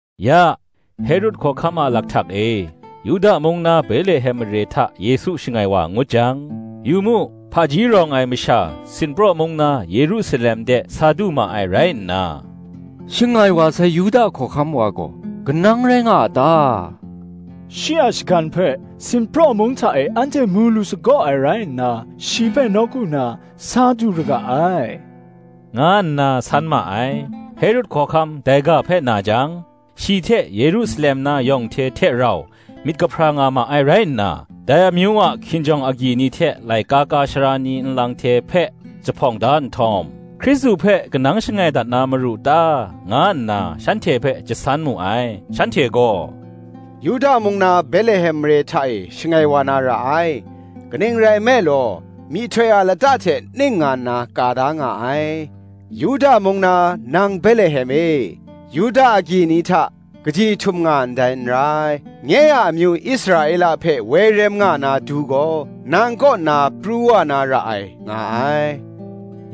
Ya, Herod hkawhkam a lakhtak e, Yuda mung na Betlehem mare hta Yesu shangai wa ngut jang, yu mu, hpaji rawng ai masha sinpraw mung na Yerusalem de sa du ma ai rai nna, “Shangai wa sai Yuda hkawhkam wa gaw, kanang rai nga a ta? shi a shagan hpe sinpraw mung hta e anhte mu lu sagaw ai rai nna, shi hpe nawku na sa du ra ga ai,” nga nna san ma ai. Herod hkawhkam dai ga hpe na jang, shi hte Yerusalem na yawng hte hte rau myit kahpra nga ma ai rai nna, dai amyu a hkinjawng agyi ni hte laika ka ai sara ni nlang hte hpe jahpawng da nhtawm, Hkristu hpe kanang shangai dat na maru ta, nga nna shanhte hpe jasan mu ai. Shanhte gaw, “Yuda mung na Betlehem mare hta e shangai wa na ra ai:” kaning rai nme law, myihtoi a lata hte ning nga nna ka da nga ai, “Yuda mung na, nang Betlehem e, Yuda agyi ni hta, kaji htum nga ndai n rai; Nye a amyu Israela hpe woi rem nga na Du gaw, Nang kaw nna pru wa na ra ai, nga ai,”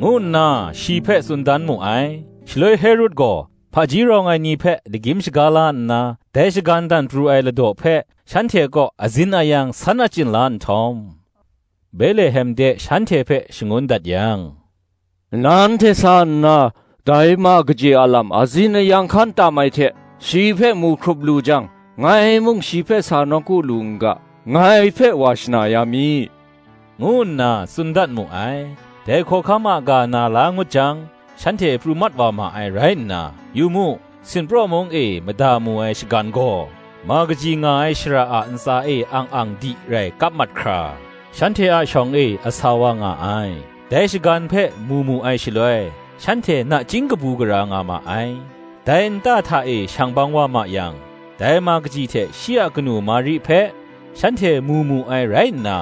ngu nna shi hpe tsun dan mu ai. Shaloi Herod gaw, hpaji rawng ai ni hpe lagyim shaga la nna, dai shagan dan pru ai ladaw hpe shanhte kaw azin ayang san achyin la nhtawm, Betlehem de shanhte hpe shangun dat yang, “Nanhte sa nna, dai ma kaji a lam azin ayang hkan tam ai hte, shi hpe mu hkrup lu jang, ngai mung shi hpe sa nawku lu n ga, ngai hpe wa shana ya mi,” ngu nna tsun dat mu ai. Dai hkawhkam a ga na la ngut jang, shanhte pru mat wa ma ai rai nna, yu mu, sinpraw mung e mada mu ai shagan gaw, ma kaji nga ai shara a ntsa e ang ang di rai kap mat hkra, shanhte a shawng e asa wa nga ai. Dai shagan hpe mu mu ai shaloi, shanhte nachying kabu gara nga ma ai. Dai nta hta e shang bang wa ma yang, dai ma kaji hte shi a kanu Mari hpe, shanhte mu mu ai rai nna,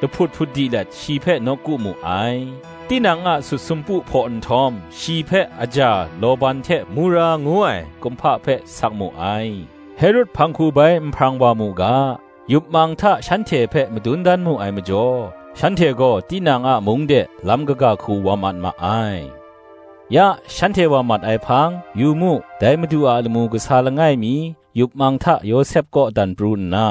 lahput hput di let shi hpe nawku mu ai: tinang a sut sumpu hpaw nhtawm, shi hpe aja, lawban hte mura ngu ai kumhpa hpe sak mu ai. Herod hpang hku bai n hprang wa mu ga, yup mang hta shanhte hpe madun dan mu ai majaw, shanhte gaw tinang a mung de, lam kaga hku wa mat ma ai. Ya shanhte wa mat ai hpang, yu mu, dai Madu a lamu kasa langai mi yup mang hta Yawsep kaw dan pru nna,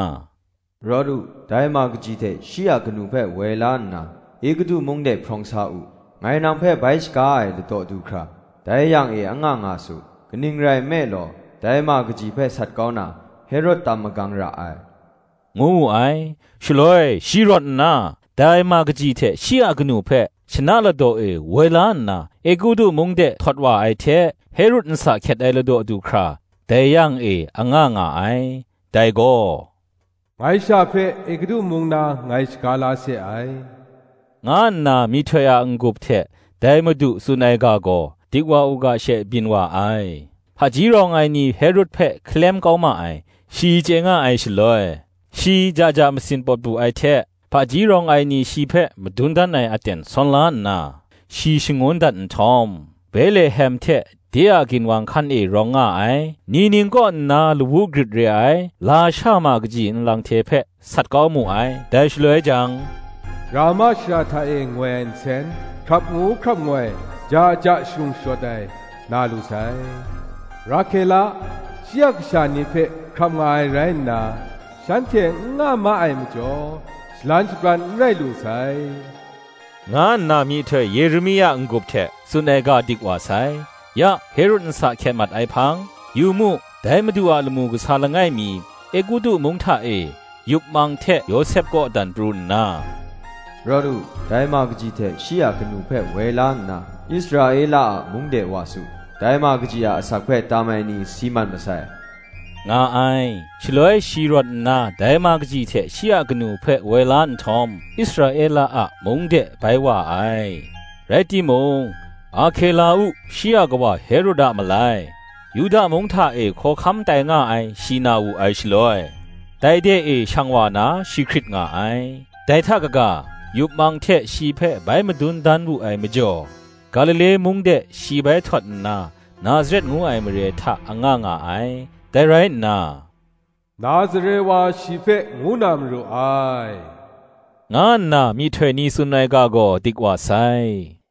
“Rawt u, dai ma kaji hte shi a kanu hpe woi la nna, Egutu mung de hprawng sa u: ngai nang hpe bai shaga ai ladaw du hkra, dai yang e anga nga su; kaning rai nme law, dai ma kaji hpe sat kau na, Herod tam magang ra ai,” ngu wu ai. Shaloi shi rawt nna, dai ma kaji hte shi a kanu hpe, shana ladaw e woi la nna, Egutu mung de htawt wa ai hte, Herod nsa hkyet ai ladaw du hkra, dai yang e anga nga ai. Dai gaw, “Ngai sha hpe Egutu mung na ngai shaga la se ai,” nga nna myihtoi a n-gup hte dai Madu tsun ai ga gaw, dik wa u ga she byin wa ai. Hpaji rawng ai ni Herod hpe hkalem kau ma ai, shi chye nga ai shaloi, shi ja ja masin pawt bu ai hte, hpaji rawng ai ni shi hpe madun dan ai aten sawn la nna, shi shangun dat nhtawm, Betlehem hte de a ginwang hkan e rawng nga ai, ni ning kaw nna lawu grit re ai lasha ma kaji nlang hte hpe, sat kau mu ai. Dai shaloi jang, Rama shara hta e ngoi ai nsen, Hkrap ngu hkrap ngoi, ja ja sharung shayawt ai, na lu sai; “Rahkela, shi a kasha ni hpe hkrap nga ai rai nna, Shanhte n nga ma ai majaw, Shalan shabran n rai lu sai,” nga nna myihtoi Yeremia n-gup hte tsun ai ga dik wa sai. Ya Herod nsa hkyet mat ai hpang, yu mu, dai madu a lamu kasa langai mi, Egutu mung hta e, yup mang hte Yawsep kaw dan pru nna, “Rawt u, dai ma kaji hte shi a kanu hpe woi la nna, Israela a mung de wa su; dai ma kaji a asak hpe tam ai ni si mat masai,” nga ai. Shaloi shi rawt nna dai ma kaji hte shi a kanu hpe woi la nhtawm, Israela a mung de bai wa ai. Rai timung, Arkela-u, shi a kawa Herod a malai, Yuda mung hta e hkawhkam tai nga ai shi na wu ai shaloi, dai de e shang wa na shi hkrit nga ai: dai hta kaga, yup mang hte shi hpe bai madun dan wu ai majaw, Galile mung de shi bai htawt nna, Nazaret ngu ai mare hta anga nga ai. Dai rai nna, “Nazare wa shi hpe ngu na maru ai,” nga nna myihtoi ni tsun ai ga gaw dik wa sai.